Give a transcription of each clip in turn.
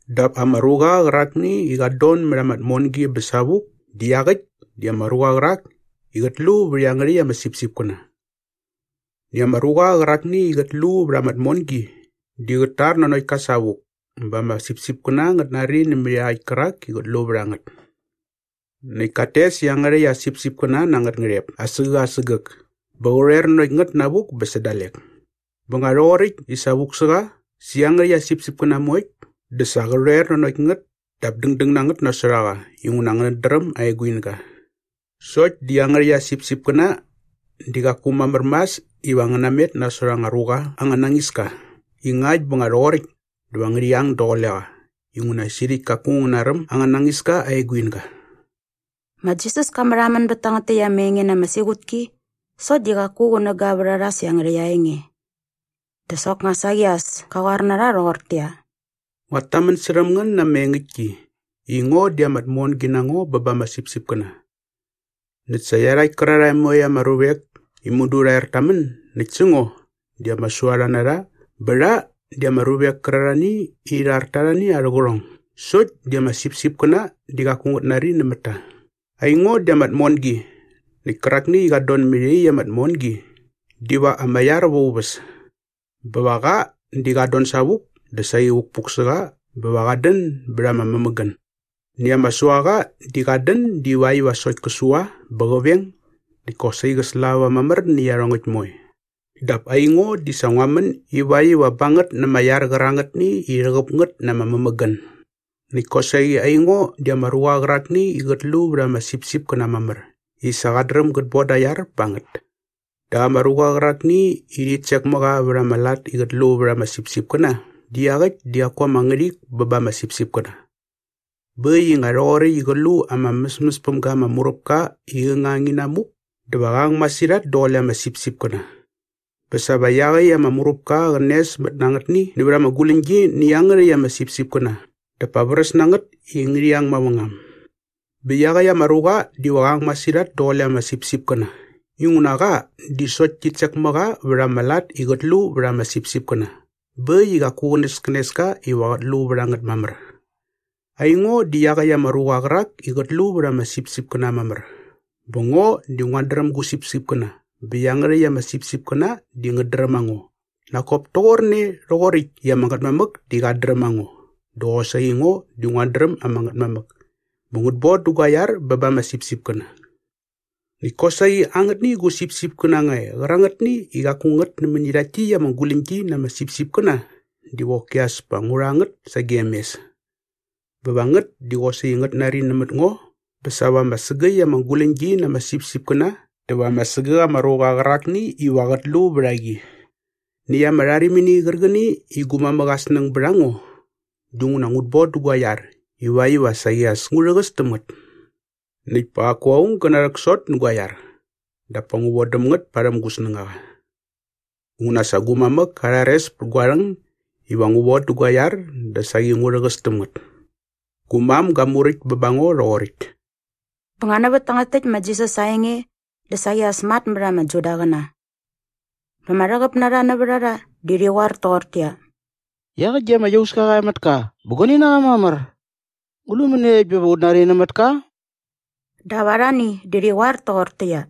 Dap ama ruqa qärakni i qat don mät ama tmongi bä savuk di iaqäkt di ama ruqa qärak i qät lu vät iangärhäkt ama sipsipkäna. Näkt ama ruqa qärakni i qät lu vät ama tmongi di qät tar nanokt ka savuk bä ama sipsipkäna ngät nari nämät iaqäkt kärak i qät lu vät a ngät. Näkt kat tes iangärhäkt aa sipsipkäna na angät ngärhep asägäk asägäk bä qä rhoer nanokt ngät navuk bä sä dalek. “Bä nga rhoqoräkt i sa vuk sä qa sä iangärhäkt aa sipsipkäna moekt dä sa qä rhoer nanokt ngät dap dängdäng na ngät nasot a qa inguna ngät dräm aa eguinga. Sokt di iangärhäkt aa sipsipkäna di qaku mamär mas iva ngä namet nasot anga ruqa anga nañis ka i ngakt bä nga rhoqoräkt dä va ngärhi ang daqule qa inguna sirhäkt kaku ngä naräm anga nañiska aa eguinga.” Ma Jisas ka märhamän bät tangät täkt ama enge na ama siqutki sokt di qaku qunäga vät a rha sä iangärhäkt aa enge. Dä soknga saqi as ka qoar na rha rhoqortäqyia, “Nguat tamän särhäm ngän na ama engäktki i ngo di ama tmongi na ngo bä ba ama sipsipkäna. Näkt sa iarhakt kärarhae moekt ama ruvek i mudu rha er ta män näkt sä ngo di ama suarha na rha bä rha di ama ruvek kärarhani i rhi rhar ta arhani arhä qärhong sokt di ama sipsipkäna di qaku ngät nari nämät ta. Aingo di ama tmongi näkt kärakni i qat don mät iaqyäkt ama tmongi diva ama iar va aa uväs. Bä va qa di qat don savuk dä saqi vukpuk sä qa bä va qat dän bät ama mämägän. “Näkt ama suaqa di qat dän divakt iva sokt kä sua bä qä veng näkt kosaqi qä slava mamär nä iarhongäkt moe. Dap aingo di sa ngua män ivakt iva ba ngät na ama iar qärangätni i rhäqäp ngät na ama mämägän. Näkt kosaqi aingo di ama ruqa qärakni i qät lu vät ama sipsipkäna mamär i sa qat dräm gät boda aa iar ba ngät. Dap ama ruqa qärakni i rhit sek mä qa vät ama lat i qät lu vät ama sipsipkäna di iaqäkt di qaku ama ngärhik bä ba ama sipsipkäna. Bä äkt i nga rhoqoräkt i qä lu ama mäsmäs päm ga ama muräpka i qä ngang inamuk dä va qä ngang masirhat daqule ama sipsipkäna. Bä sa va iaqäkt ama muräpka qä nesmät na angätni nävät ama guläñgi nä iangärhäkt ama sipsipkäna dap pa vräs na ngät i ngärhi ang mavängam. Bä iaqäkt ama ruqa diva qä ang masirhat daqule ama sipsipkäna inguna qa di sokt tit sek mä qa vät ama lat i qät lu vät ama sipsipkäna bä äkt i qaku qänäskänes ka iva qät lu vät a ngät mamär. “Aingo di iaqäkt ama ruqa qärak i qät lu vät ama sipsipkäna mamär bä ngo di nguat dräm gu sipsipkäna bä iangärhäkt ama sipsipkäna di ngät dräm a ngo nak kop toqorne rhoqoräkt i ama Ngätmamäk di qat dräm a ngo dä qosaqi ngo di nguat dräm ama Ngätmamäk. Bä ngut bodä gua iar bä ba ama sipsipkäna. Näkt kosaqi angätni gu sipsipkäna nga e qärangätni i qaku ngät nämäni rhakt täkt ama guläñgi na ama sipsipkäna diva qoki as pa ngu rha ngät sagem mes. Bä va ngät di qosaqi ngät nari nämät ngo bä sa va ama sägäkt ama guläñgi na ama sipsipkäna dä va ama sägäk ama ruqa qärakni iva qät lu vät a qi. “Näkt ama rharimini qärqäni i gu mamäk aa snäng bät a ngo dinguna ngut bodä gua iar ivakt iva saqi as ngu rhäqäs täm ngät. Näkt pa qaku aung gä narhäksot nä gua iar dap pa ngu vodäm ngät parhäm gu snängaqa. Inguna sa gu mamäk ka rhares pät gua rhäng iva ngu vodä gua iar dä saqi ngu rhäqäs täm ngät. Gu mam ga muräkt bä ba ngo rhoqoräkt.” Bä nga nävät tangät täkt ma Jisas aa enge dä saqi as matmät ama Judaqäna. Bä ama rhäqäp na rha nävät a rha di rhi qoar toqortäqyia, “Iaqäkt di ama iauska qa e mät ka bä guani na qa mamär. Ngu lu mäniekt bä va ut nari nämät ka?” Dap arhani di rhi qoar toqortäqyia,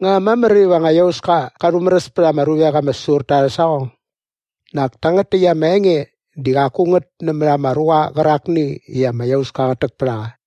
“Nga mamär iva anga iauska qa rhumäräs pät ama ruvek ama säsur ta arhä saqong? Nak tangät täkt ama enge di qaku ngät nämät ama ruqa qärakni i ama iauska qät täk pät a qa.”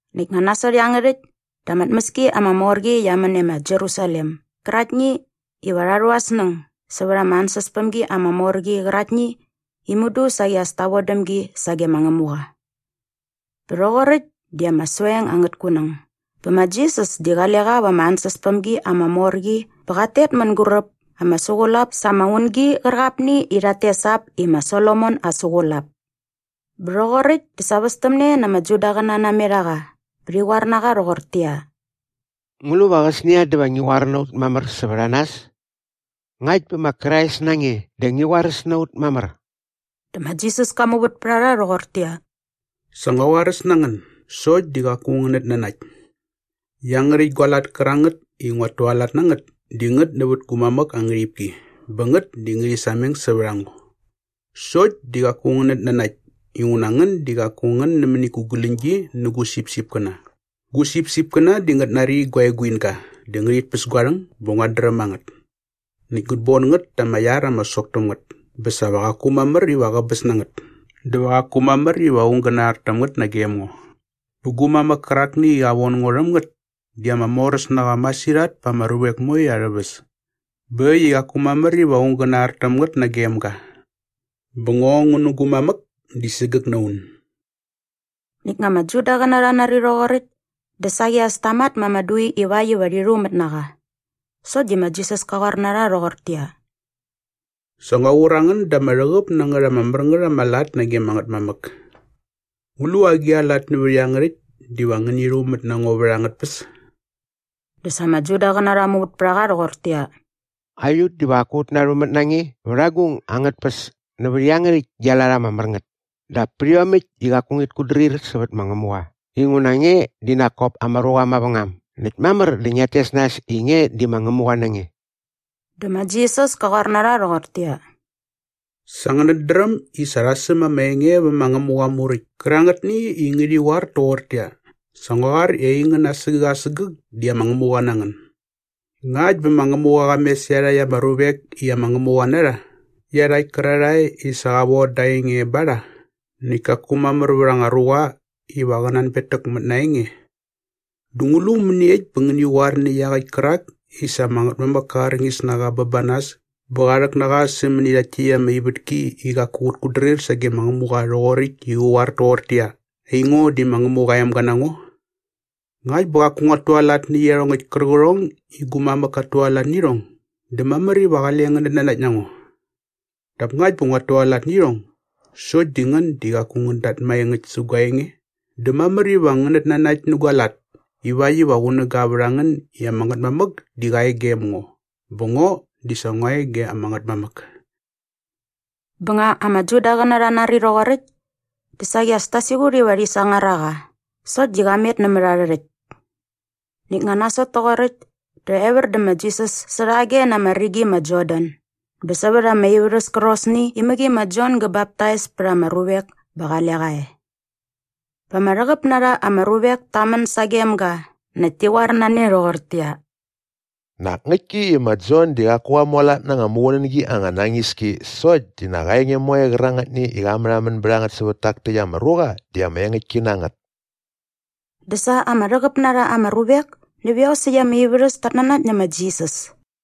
Näkt nga nasot iangärhäkt dä ama tmäski ama mor qi qia män e ma Jerusalem gäraktni iva rha rhu arhä snäng sävät ama ansäspämgi ama mor qi qäraktni i mudu saqi as ta vodäm gi sage ma Ngämuqa. Bä rhoqoräkt di ama soeng angät kunäng bä ma Jisas di qale qa va ama ansäspämgi ama mor qi bä qat tet mänguräp ama suqulap sa ama ungi qärqapni i rhat tes ap i ma Solomon Aa Suqulap. Bä rhoqoräkt dä sa västämne na ama Judaqäna namet a qa bä rhi qoar na qa rhoqortäqyia, “Ngu lu va qäsnia dä va ngi qoar na ut mamär sävät a nas? Ngakt bä ma Krais na nge dä ngi qoaräs na ut mamär.” Dä ma Jisas ka muvät pät a rha rhoqortäqyia, “Sa ngua qoaräs na ngän sokt di qaku ngänät nanakt. Iangärhäkt gua lat kärangät i nguat tualat na ngät di ngät nävät gu mamäk aa ngärhipki bä ngät di ngärhi sameng sävät a ngo sokt di qaku ngänät nanakt inguna ngän di qaku ngän nämäni gu guläñgi nä gu sipsipkäna. Gu sipsipkäna di ngät nari gua eguinga dä ngärhit päs gua rhäng bä nguat dräm a ngät. Näkt ngut bon ngät ta ama iar ama sok täm ngät bä sa va qaku mamär iva qäbäs na ngät dä va qaku mamär iva aung gä nar täm ngät nagem ngo. Bä gu mamäk kärakni i qa von ngo rhäm ngät di ama moräs na qa masirhat pa ama ruvek moe arhä väs bä äkt i qaku mamär iva aung gä nar täm ngät nagem ga. Bä ngo ngu na ama Ngätmamäk di sägäk na un.” Näkt nga ama Judaqäna rha nari rhoqoräkt dä saqi as ta mat ma ama dui ivakt iva rhi rhumät na qa. Sokt di ma Jisas ka qoar na rha rhoqortäqyia, “Sa ngua qur a ngän da ama rhäqäp na ngät ama mär ngät ama lat nage ama Ngätmamäk. Ngu lu agi a lat nävät iangärhäkt diva ngäni rhumät na ngo vät angät tpäs?” Dä sa ama Judaqäna rha muvät pät a qa rhoqortäqyia, “Aiut diva qaku ut narhumät na nge vät agung angät tpäs nävät iangärhäkt gia lat ama mär ngät dap pät iomäkt i qaku ngit kutdrir sävät ma Ngämuqa inguna nge di nak kop ama ruqa mavängam näkt mamär dä ngiat tes nas i nge di ma Ngämuqa na nge.” Dä ma Jisas ka qoar na rha rhoqortäqyia, “Sa ngänät dräm i sa rha säm ama enge vä ma Ngämuqa aa Muräkt kärangätni i ngärhi qoar toqortäqyia, ‘Sa ngua qoar i aingän asägäk asägäk di ama ngämuqa na ngän.’ Ngakt bä ma Ngämuqa qa mes iarhakt ama ruvek i ama ngämuqa na rha iarhakt kärarhae i sa qa von da aa enge ba rha näkt kaku mamär vät anga ruqa iva qä nanbetäk mät na aa enge dä ngu lu mäniekt bä ngäni qoar nä iaqäkt kärak i sa ama Ngätmamäk ka arñis na qa bä ba nas bä qa rhäk na qa sämäni rhakt täkt ama ivätki i qaku qät kutdrir sage ma Ngämuqa rhoqoräkt i qä qoar toqortäqyia, ‘Aingo di ma Ngämuqa aa emga na ngo’? Ngakt bä qaku nguat tualat nä iarhongäkt kärqärhong i gu mamäk kat tualat nä irhong dä mamär iva qale ngänät nanakt na ngo. Dap ngakt bä nguat tualat nä iarhongäkt sokt di ngän di qaku ngän dat maengäkt sä gua enge dä mamär iva ngänät nanakt nä gua lat ivakt iva qunäga vät a ngän i ama Ngätmamäk di qa e gem ngo bä ngo di sa ngua e ge ama Ngätmamäk.” Bä nga ama Judaqäna rha nari rhoqoräkt dä saqi as ta siqut iva rhi sangar a qa sokt di qa met nämät arhä rhäkt. Näkt nga nasot toqoräkt dä evär dä ma Jisas särhage na ama rigi ma Jordan bä sävät ama ivärhäs kärqosni i mäqi ma Jon gä baptais pät ama ruvek bä qale qa e. Bä ama rhäqäp na rha ama ruvek ta män sagem ga näkt ti qoar na ne rhoqortäqyia, “Nak ngäktki i ma Jon di qaku qa mualat na anga muqunängi anga nañis ki sokt di nak aa enge moe qärangätni i qa märhamän bät a ngät sävät tak täkt ama ruqa di ama engäktki na ngät.” Dä sa ama rhäqäp na rha ama ruvek nävät iosäkt ama ivärhäs tat nanakt nä ma Jisas.